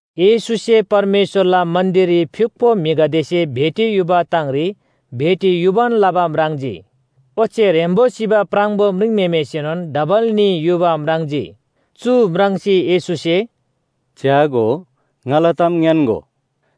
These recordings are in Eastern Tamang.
येशूसे परमेश्‍वरला मन्‍दिररी फ्‍युक्‍पो म्‍हिगदेसे भेटी युबा ताङरी भेटी युबान लबा म्राङ्जी। ओच्‍छे ह्रेम्‍बो सिबा प्राङबो म्रिङम्‍हेमेसेनोन डबल न्‍ही युबा म्राङ्जी। चु म्राङ्सी येशूसे, “च्‍यागो, ङाला ताम ङ्‌यान्‍गो।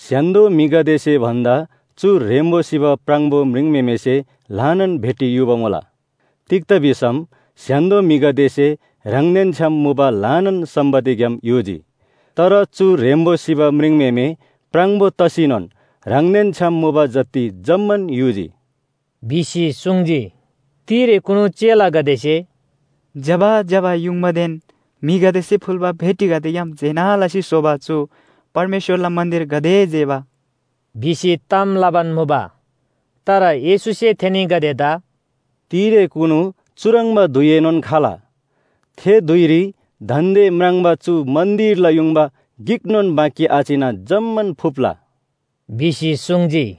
स्‍य्‍हान्‍दो म्‍हिगदेसे भन्‍दा चु ह्रेम्‍बो सिबा प्राङबो म्रिङम्‍हेमेसे ल्‍हानान भेटी युबा मुला। तिग्‍दा भिसम स्‍य्‍हान्‍दो म्‍हिगदेसे ह्राङदेन छ्‌याम मुबा ल्‍हानान सम्‍पत्तिग्‍याम युजी, तर चु ह्रेम्‍बो सिबा म्रिङम्‍हेमे प्राङबो तसीनोन ह्राङदेन छ्‌याम मुबा जति जम्‍मान युजी” भिसी सुङ्जी। तिरेकुनु चेलागदेसे, “ज्‍यबा ज्‍यबा युङबादेन म्‍हिगदेसे फुल्‍बा भेटीगदेग्‍याम जेना लसी स्‍होबा चु परमेश्‍वरला मन्‍दिर गाते जेबा!” भिसी ताम लबान मुबा। तर येशूसे थेनीगदेदा, “तिरेकुनु चुह्रङ्बा धुइएनोन खाल, थे धुइरी दान्‍दे म्राङ्बा चु मन्‍दिरला युङबा गिकनोन बाँकी आचिना जम्‍मान फुप्‍ला” भिसी सुङ्जी।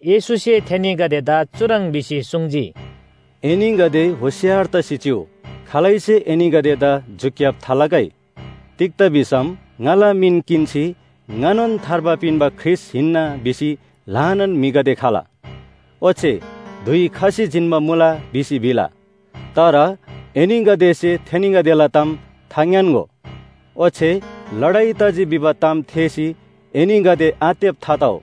येशूसे थेनीगदेदा चुह्रङ् भिसी सुङ्जी, “एनीगदे होशियार तसी चिउ, खालैसे एनीगदेदा झुक्‍याब थालगै। तिग्‍दा भिसम ङाला मिन किन्‍सी ‘ङानोन थार्बा पिन्‍बा ख्रीष्‍ट हिन्‍ना’ भिसी ल्‍हानान म्‍हिगदे खला। ओच्‍छे ‘धुइ खसी जिन्‍बा मुला’ भिसी भिला, तर एनीगदेसे थेनीगदेला ताम थाङ्‌यान्‍गो। ओच्‍छे लडाइ तजी भिबा ताम थेःसी एनीगदे आत्तेब थातउ,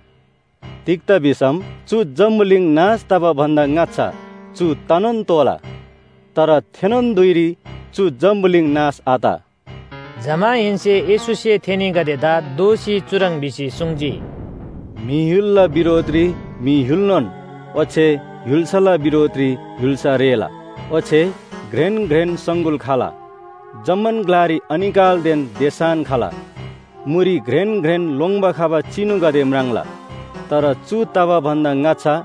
तिग्‍दा भिसम चु जम्‍बुलिङ नाश तबा भन्‍दा ङाच्‍छा चु तनोन तोःला। तर थेनोन धुइरी चु जम्‍बुलिङ नाश आत।” जमाहेन्‍से येशूसे थेनीगदेदा दोःसी चुह्रङ् भिसी सुङ्जी, “म्‍हि य्‍हुलला बिरोधरी म्‍हि य्‍हुलनोन ओच्‍छे य्‍हुल्‍साला बिरोधरी य्‍हुल्‍सा रेःला। ओच्‍छे घ्रेन घ्रेन सङगुल खला, जम्‍मान ग्‍लारी अनिकालदेन देसान खला। मुरी घ्रेन घ्रेन लोङ्‌बा खबा चिनुगदे म्राङ्ला। “तर चु तबा भन्‍दा ङाच्‍छा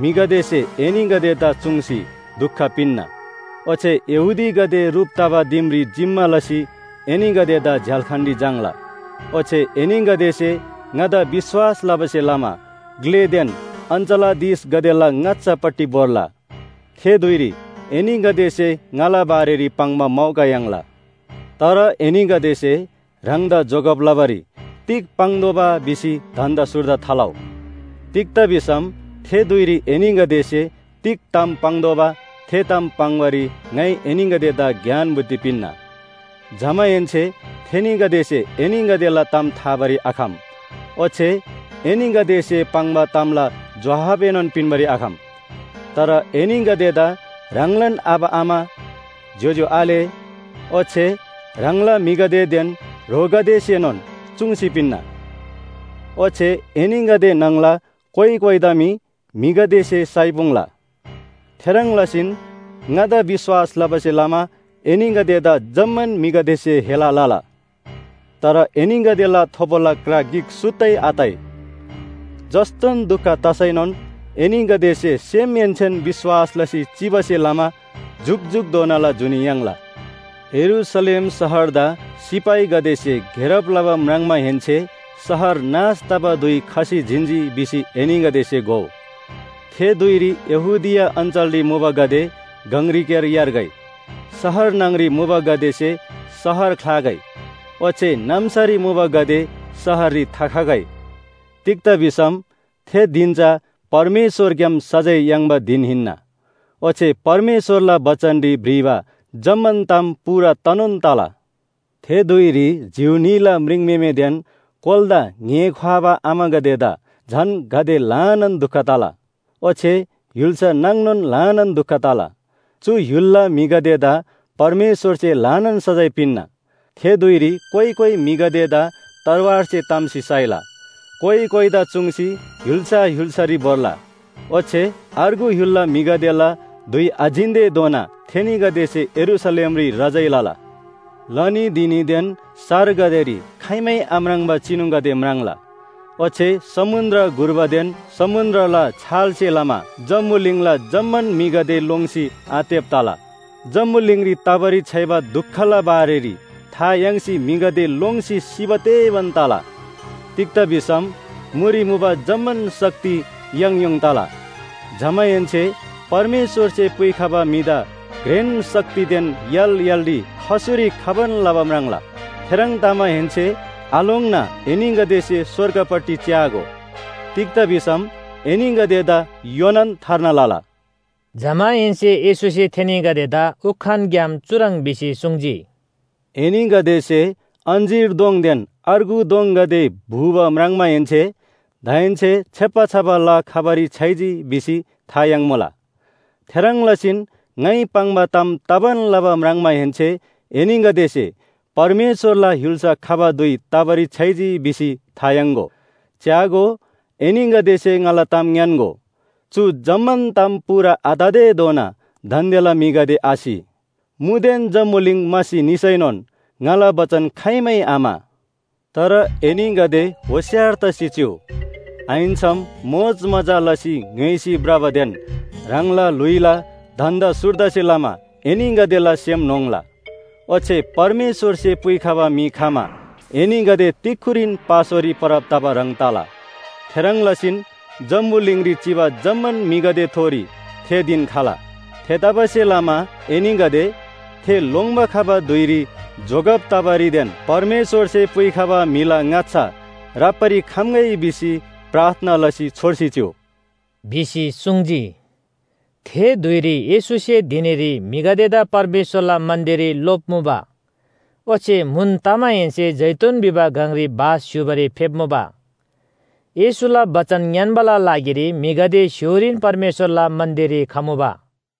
म्‍हिगदेसे एनीगदेदा चुङ्सी दुख पिन्‍ना। ओच्‍छे यहूदीगदे ह्रुप तबा दिमरी जिम्‍मा लसी एनीगदेदा झ्‍याल्‍खानरी झाङ्‌ला। ओच्‍छे एनीगदेसे ङादा विश्‍वास लबासे लमा ग्‍लेदेन अञ्‍चलाधीशगदेला ङाच्‍छापट्टि भोर्ला। थे धुइरी एनीगदेसे ङाला बारेरी पाङ्बा मौका याङ्ला। तर एनीगदेसे ह्राङदा जोगब लबारी तिग पाङ्तोःबा भिसी धन्‍दा सुर्दा थालउ। तिग्‍दा भिसम थे धुइरी एनीगदेसे तिग ताम पाङ्तोःबा थे ताम पाङ्‌बारी ङाइ एनीगदेदा ज्ञान बुद्धि पिन्‍ना। जमाहेन्‍से थेनीगदेसे एनीगदेला ताम थाबारी आखम ओच्‍छे एनीगदेसे पाङ्बा तामला जोहाबएनोन पिन्‍बारी आखम। तर एनीगदेदा ह्राङलान आबा आमा, ज्‍योज्‍यो आले ओच्‍छे ह्राङला म्‍हिगदेदेन ह्रोगदेसेनोन चुङ्सी पिन्‍ना। ओच्‍छे एनीगदे न्‍हङला कोइ कोइदा मी म्‍हिगदेसे साइपुङ्‍ला। थेह्रङ् लसीन ङादा विश्‍वास लबासे लमा एनीगदेदा जम्‍मान म्‍हिगदेसे हेला लला। तर एनीगदेला थोबोला क्रा गिक सुत्तै आताइ। जस्‍तोन दुख तसैनोन एनीगदेसे सेमहेन्‍सेन विश्‍वास लसी चिबासे लमा जुकजुकधोनाला जुनी याङ्ला। “यरूशलेम शहरदा सिपाहीगदेसे घेरब लबा म्राङ्माहेन्‍से शहर नाश तबा धुइ खसी जिन्‍जी भिसी एनीगदेसे घोउ। थे धुइरी यहूदिया अञ्‍चलरी मुबागदे गङरीक्‍यार यार्गै, शहर न्‍हङरी मुबागदेसे शहर ख्‍लागै ओच्‍छे नाम्‍सारी मुबागदे शहररी थाखगै। तिग्‍दा भिसम थे धिन चा परमेश्‍वरग्‍याम सजाय याङ्बा धिन हिन्‍ना। ओच्‍छे परमेश्‍वरला बचनरी भ्रिबा जम्‍मान ताम पूरा तनोन तला। थे धुइरी जिउ न्‍हीला म्रिङम्‍हेमेदेन कोलादा ङ्‍हे ख्‍वाबा आमागदेदा झन गाते ल्‍हानान दुख तला! ओच्‍छे य्‍हुल्‍सा नाङनोन ल्‍हानान दुख तला। चु य्‍हुलला म्‍हिगदेदा परमेश्‍वरसे ल्‍हानान सजाय पिन्‍ना। थे धुइरी कोइ कोइ म्‍हिगदेदा तरवारसे ताम्‍सी साइला, कोइ कोइदा चुङ्सी य्‍हुल्‍सा य्‍हुल्‍सारी भोर्ला। ओच्‍छे अर्गु य्‍हुलला म्‍हिगदेला धुइ आजिन्‍तेधोना थेनीगदेसे यरूशलेमरी रजाइँ लला। “लनी धिनीदेन सारगदेरी खाइमै आम्राङ्बा चिनुगदे म्राङ्ला। ओच्‍छे समुन्‍द्र घुर्बादेन समुन्‍द्रला छालसे लमा जम्‍बुलिङला जम्‍मान म्‍हिगदे लोङ्सी आत्तेब तला। जम्‍बुलिङरी तबारी छ्‌याइबा दुखला बारेरी था याङ्सी म्‍हिगदे लोङ्सी सिबा तेबान तला। तिग्‍दा भिसम मुरी मुबा जम्‍मान शक्ति याङयोङ तला। जमाहेन्‍से परमेश्‍वरसे पुइखबा म्‍हिदा घ्रेन शक्तिदेन य्‍हाल य्‍हालरी खसुरी खबान लबा म्राङ्ला। थेह्रङ् तमाहेन्‍से आलोङ्ना एनीगदेसे स्‍वर्गपट्टि च्‍यागो, तिग्‍दा भिसम एनीगदेदा योनान थार्ना लला।” जमाहेन्‍से येशूसे थेनीगदेदा उखानग्‍याम चुह्रङ् भिसी सुङ्जी, “एनीगदेसे अञ्‍जीर दोङदेन अर्गु दोङगदे, भुबा म्राङ्माहेन्‍से दाहेन्‍से छेप्‍बा छबा ला खबारी छ्‌याइजी भिसी था याङ्मुला। थेह्रङ् लसीन ङाइ पाङ्बा ताम तबान लबा म्राङ्माहेन्‍से एनीगदेसे परमेश्‍वरला य्‍हुल्‍सा खबा धुइ तबारी छ्‌याइजी भिसी था याङ्‍गो। “च्‍यागो, एनीगदेसे ङाला ताम ङ्‌यान्‍गो, चु जम्‍मान ताम पूरा आततेधोना दान्‍देला म्‍हिगदे आसि। मुदेन जम्‍बुलिङ म्‍हासी निसैनोन ङाला बचन खाइमै आम्‍हा।” “तर एनीगदे होशियार तसी चिउ, आहिन्‍सम मोजमजा लसी ङ्‌य्‍होइसी भ्रबादेन ह्राङला ल्‍हुइला धन्‍दा सुर्दासे लमा एनीगदेला सेम न्‍होङ्ला। ओच्‍छे परमेश्‍वरसे पुइखबा म्‍हि खमा एनीगदे तिक्‍खुरीन पासोरी परब तबा ह्रङ् तला। थेह्रङ् लसीन जम्‍बुलिङरी चिबा जम्‍मान म्‍हिगदेथोरी थे धिन खला। थेतबासेलमा एनीगदे ‘थे लोङ्‌बा खबा धुइरी जोगब तबारीदेन परमेश्‍वरसे पुइखबा म्‍हिला ङाच्‍छा राप्‍बारी खम्‍गै भिसी प्रार्थना लसी छोर्सी चिउ’ भिसी सुङ्जी।” थे धुइरी येशूसे धिनीरी म्‍हिगदेदा परमेश्‍वरला मन्‍दिररी लोप्‍मुबा, ओच्‍छे म्‍हुन तमाहेन्‍से जैतून भिबा गङरी बास स्‍य्‍हूबारी फेप्‍मुबा। येशूला बचन ङ्‌यान्‍बाला लागिरी म्‍हिगदे स्‍य्‍होरीन परमेश्‍वरला मन्‍दिररी खमुबा।